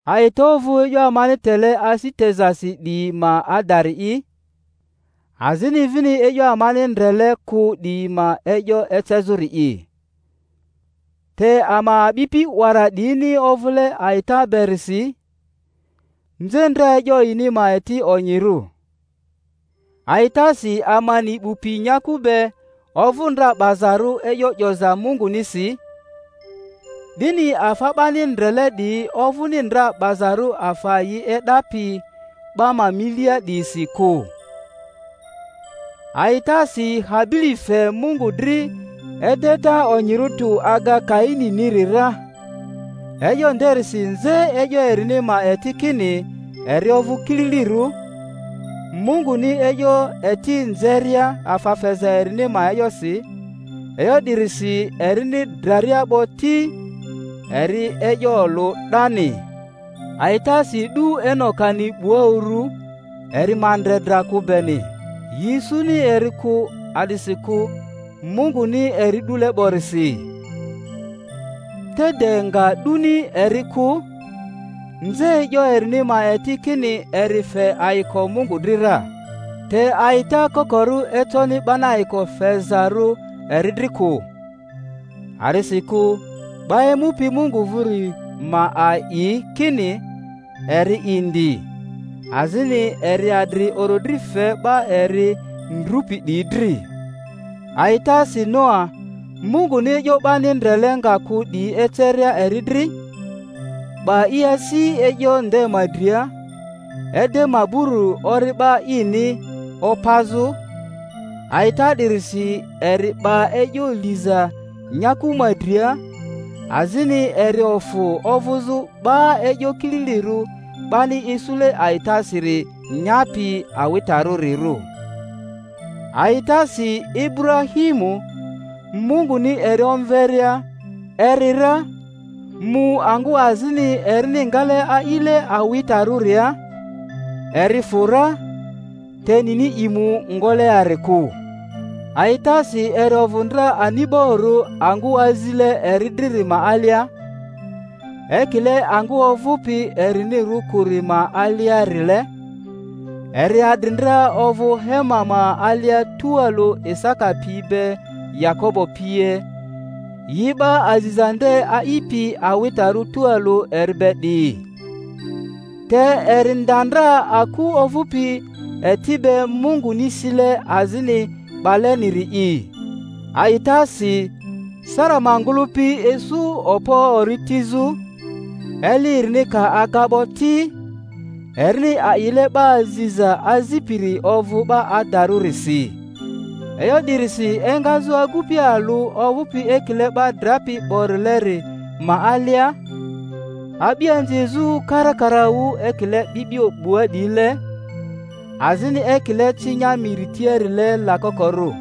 A'ita ovᴜ e'yo amani tele asi tezasi 'diyi ma adari'i, azini vini e'yo amani ndrele kᴜ 'diyi ma e'yo ecezᴜri'i. Te ama a'bipi 'wara 'diyini ovᴜle a'ita berisi, nze ndra e'yo yini ma eti onyirᴜ. A'itasi ama ni 'bu pi nyaku be ovᴜ ndra 'bazarᴜ e'yo 'yoza Mungunisi, 'dini afa 'bani ndrele 'diyi ovᴜni ndra 'bazarᴜ afa yi e'dapi 'ba ma milia 'diyisi kᴜ. Aitasi Habili fe Mungu dri edeta onyirᴜ tᴜ aga Kaininiri ra, e'yo nderisi nze e'yo erini ma eti kini eri ovᴜ kililirᴜ, Munguni e'yo eti nzeria afa feza erini ma e'yosi; e'yo 'dirisi erini draria 'bo ti, eri e'yo olᴜ 'dani. A'itasi 'du Enokani 'bua uru, eri ma ndre dra kᴜ beni; yi isuni eri kᴜ, a'disikᴜ Munguni eri 'dule 'borisi. Te de nga 'duni eri kᴜ, nze e'yo erini ma eti kini eri fe ayiko Mungu dri ra. Te a'ita kokorᴜ econi 'bani ayiko fezarᴜ eri dri kᴜ. A'disikᴜ 'ba emupi Mungu vᴜri ma a'i kini eri indi, azini eri adri orodri fe 'ba eri ndrupi 'diyi dri. A'itasi Noa, Munguni e'yo 'bani ndrele nga kᴜ 'diyi eceria eri dri, 'ba i asi e'yo nde ma dria, ede maburu ori'ba ini opazᴜ; a'ita 'dirisi eri 'ba e'yo liza nyaku ma dria, azini eri ofᴜ ovᴜzᴜ 'ba e'yo kililirᴜ 'bani isule a'itasiri nyapi awitarᴜrirᴜ. A'itasi Iburahimu, Munguni eri omveria, eri ra, mu angᴜ azini erini ngale a'ile awitarᴜria; eri fᴜ ra, te nini i mu ngoleari kᴜ. A'itasi eri ovᴜ ndra ani'borᴜ angᴜ azile eri driri ma alia, ekile angᴜ ovᴜpi erinirᴜ kᴜri ma aliarile, eri adri ndra ovᴜ hema ma alia tualᴜ Isaka pi be Yakobo pie, yi 'ba aziza nde a'ipi awitarᴜ tualᴜ eri be 'diyi. Te eri nda ndra aku ovᴜpi eti be, Munguni sile azini 'baleniri'i. A'itasi Sara ma ngᴜlᴜpi isu okpo ori tizᴜ, eli erini ka aga 'bo ti, erini a'ile 'ba aziza azipiri ovᴜ 'ba adarᴜrisi. E'yo 'dirisi engazᴜ agupi alᴜ ovᴜpi ekile 'ba drapi 'borileri ma alia, a'bianzi ezᴜ karakaraᴜ ekile 'bi'bio 'bua 'diyile, azini ekile cinya miri tiarile lakokorᴜ.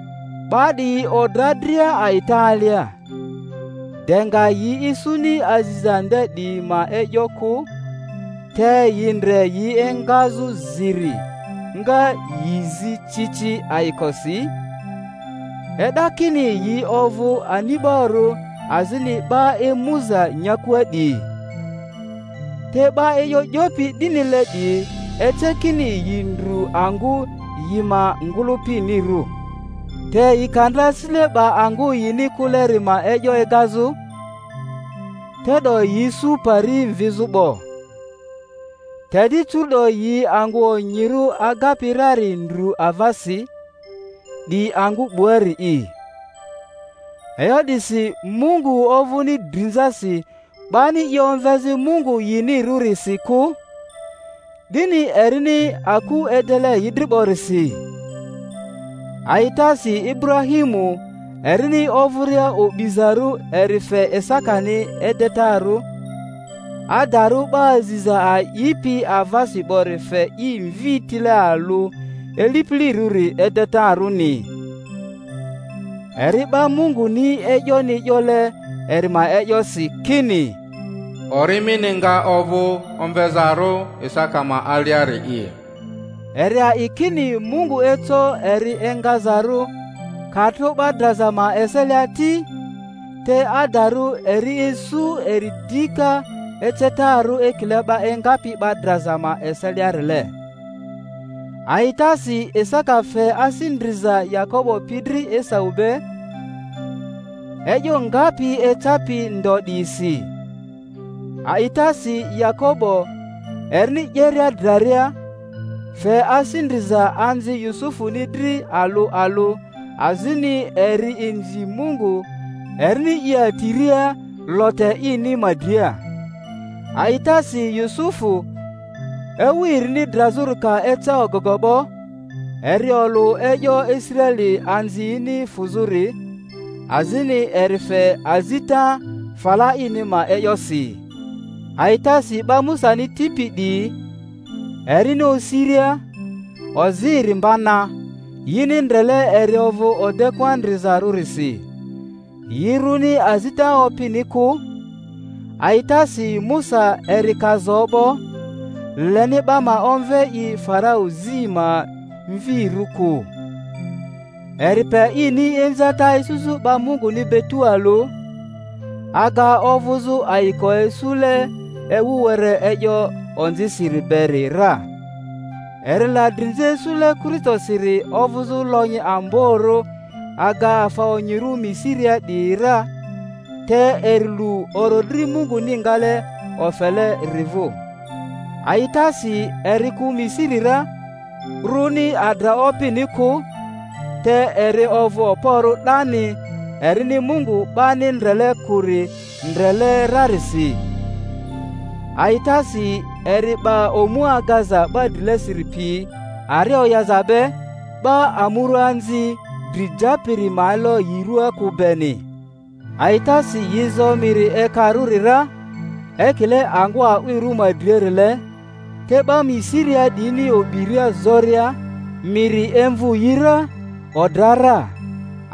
'Ba 'diyi odra dria a'ita alia, de nga yi isuni aziza nde 'diyi ma e'yo kᴜ, te yi ndre yi engazᴜ ziri, nga yI zI ci ci ayIkosi, e'da kini yi ovᴜ ani'barᴜ azini 'ba emuza nyakua 'diyi. Te 'ba e'yo 'yopi 'dinile 'diyi ece kini yi ndru angᴜ yi ma ngᴜlᴜpinirᴜ. Te yi ka ndra asisile 'ba angᴜ yini kᴜleri ma e'yo egazᴜ, te'do yi isu pari mvIzᴜ 'bo. Te di curu'do yi angᴜ onyirᴜ agapi rari ndru avasi, 'di angᴜ 'buarii. E'yo 'disi Mungu ovᴜni drinzasi 'bani i omvezᴜ Mungu yinirᴜrisi kᴜ, 'dini erini aku edele yi dri 'borisi. A'itasi Iburahimu, erini ovᴜria o'bizarᴜ, eri fe Isakani edetarᴜ, adarᴜ 'ba aziza a'ipi avasi 'bori fe i mvi tile alᴜ ilipilirᴜri edetarᴜni; eri 'ba Munguni e'yoni 'yole eri ma e'yosi kini, Ori mini nga ovᴜ omvezarᴜ Isaka ma aliari'i. Eri a'i kini Mungu eco eri engazarᴜ, ka tro 'ba draza ma eselia ti; te adarᴜ eri isu eri dika ecetarᴜ ekile 'ba engapi 'ba draza ma eseliarile. A'itasi Isaka fe asi ndriza Yakobo pi dri Esau be, e'yo ngapi ecapi ndo 'diyisi. A'itasi Yakobo, erini 'yeria draria, fe asi ndriza anzi Yusufuni dri alᴜ alᴜ, azini eri inzi Mungu, erini i atiria lote ini ma dria. A'itasi Yusufu, ewu erini drazᴜri ka eca ogogo 'bo, eri olᴜ e'yo Israeli anziyini fᴜzᴜri, azini eri fe azita fala ini ma e'yosi. A'itasi 'ba Musani tipi 'diyi, erini osiria, ozi eri mba na, yini ndrele eri ovᴜ odekᴜa ndrizarᴜrisi; yi rᴜni azita opini kᴜ. A'itasi Musa, eri ka zo 'bo, leni 'ba ma omve i Farau zi ma mvirᴜ kᴜ; eri pe ini inzata isuzᴜ 'ba Munguni be tualᴜ, aga ovᴜzᴜ ayiko isule ewu were e'yo onzisiri beri ra. Eri la drinza isule Kristosiri ovᴜzᴜ lonyi amborᴜ aga afa onyirᴜ Misiria 'diyi ra, te eri lu orodri Munguni ngale ofeleri vᴜ. A'itasi eri kᴜ Misiri ra, rᴜni adra opini kᴜ; te eri ovᴜ okporᴜ 'dani erini Mungu 'bani ndrele kᴜri ndrele rarisi. A'itasi eri 'ba omu agaza 'ba drilesiri pi ari oyaza be, 'ba amuruaanzi dri japiri ma elo yi rua kᴜ beni. A'itasi yi zo Miri Ekarᴜri ra, ekile angᴜ a'wirᴜ ma driarile; te 'ba Misiria 'diyini o'biria zoria, miri emvᴜ yi ra, odra ra.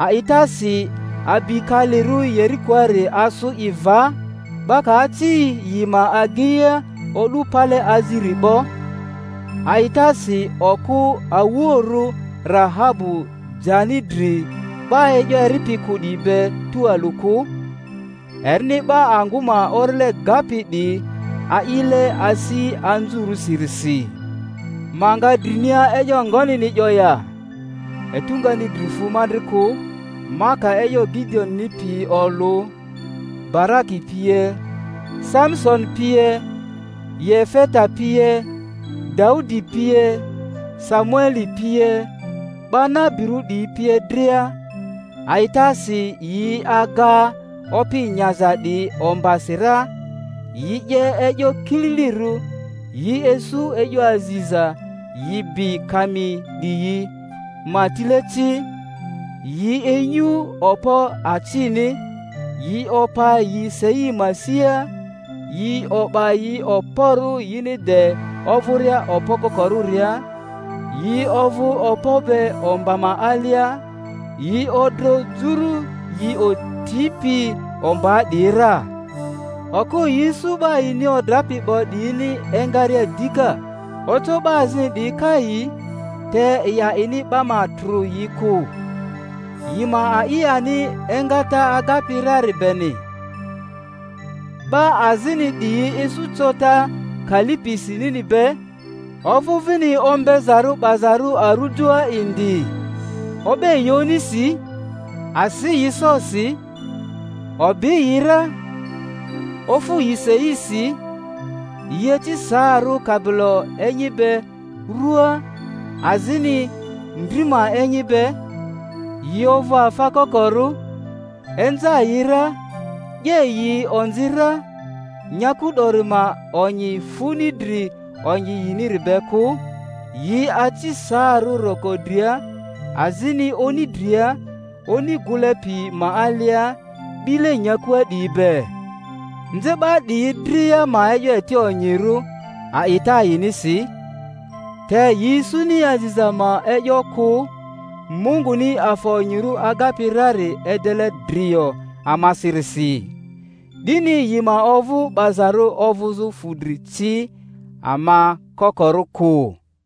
A'itasi abi kalirᴜ Yerikoari asᴜ i va, 'ba ka aci yi ma ageia o'du pale aziri 'bo. A'itasi okᴜ awuoᴜrᴜ Rahabu jani dri 'ba e'yo eripi kᴜ 'diyi be tualᴜ kᴜ, erini 'ba angᴜ ma orile gapi 'diyi a'ile asi anzurᴜsirisi. Ma nga drinia e'yo ngonini 'yo ya? Etu ngani dri fu ma dri kᴜ, ma ka e'yo Gideoni pini olᴜ, Baraki pie, Samisoni pie, Yefeta pie, Daudi pie, Samueli pie, 'ba nabirᴜ 'diyi pie dria a'itasi yi aga opi nyaza 'diyi ombasi ra, yi 'ye e'yo kililirᴜ, yi isu e'yo aziza, yi bi kami 'diyi ma tile ci, yi inyu okpo acini, yi opa yi sei ma sia, yi o'ba yi okporᴜ yini de ovᴜria okpo kokorᴜria, yi ovᴜ okpo be omba ma alia, yi odro juru yi otipi ombaa 'diyi ra. Okᴜ yi isu 'ba yini odrapi 'bo 'diyini engaria dika. Oco 'ba azini 'diyi kai, te yi a'ini 'ba ma trᴜ yi kᴜ, yi ma a'i ani engata agapi rari beni. 'Ba azini 'diyi isu cota, kali pisi nini be, ovᴜ vini ombezarᴜ 'bazarᴜ arujoa indi. O'be yi onisi, asi yi sosi, o'bi yi ra, ofu yi seisi; yi aci saarᴜ kabilo enyi be ruaa, azini ndri ma enyi be, yi ovᴜ afa kokorᴜ, inza yi ra, 'ye yi onzi ra nyaku 'dori ma onyi funi dri onyi yiniri be kᴜ—yi aci saarᴜ roko dria, azini oni dria, oni gᴜle pi ma alia, 'bile nyakua 'diyi be. Nze 'ba 'diyi dria ma e'yo eti onyirᴜ a'ita yinisi, te yi isuni aziza ma e'yo kᴜ, Munguni afa onyirᴜ agapi rari edele drio amasirisi, 'dini yi ma ovᴜ 'bazarᴜ ovᴜzᴜ fudri ci ama kokorᴜ kᴜ.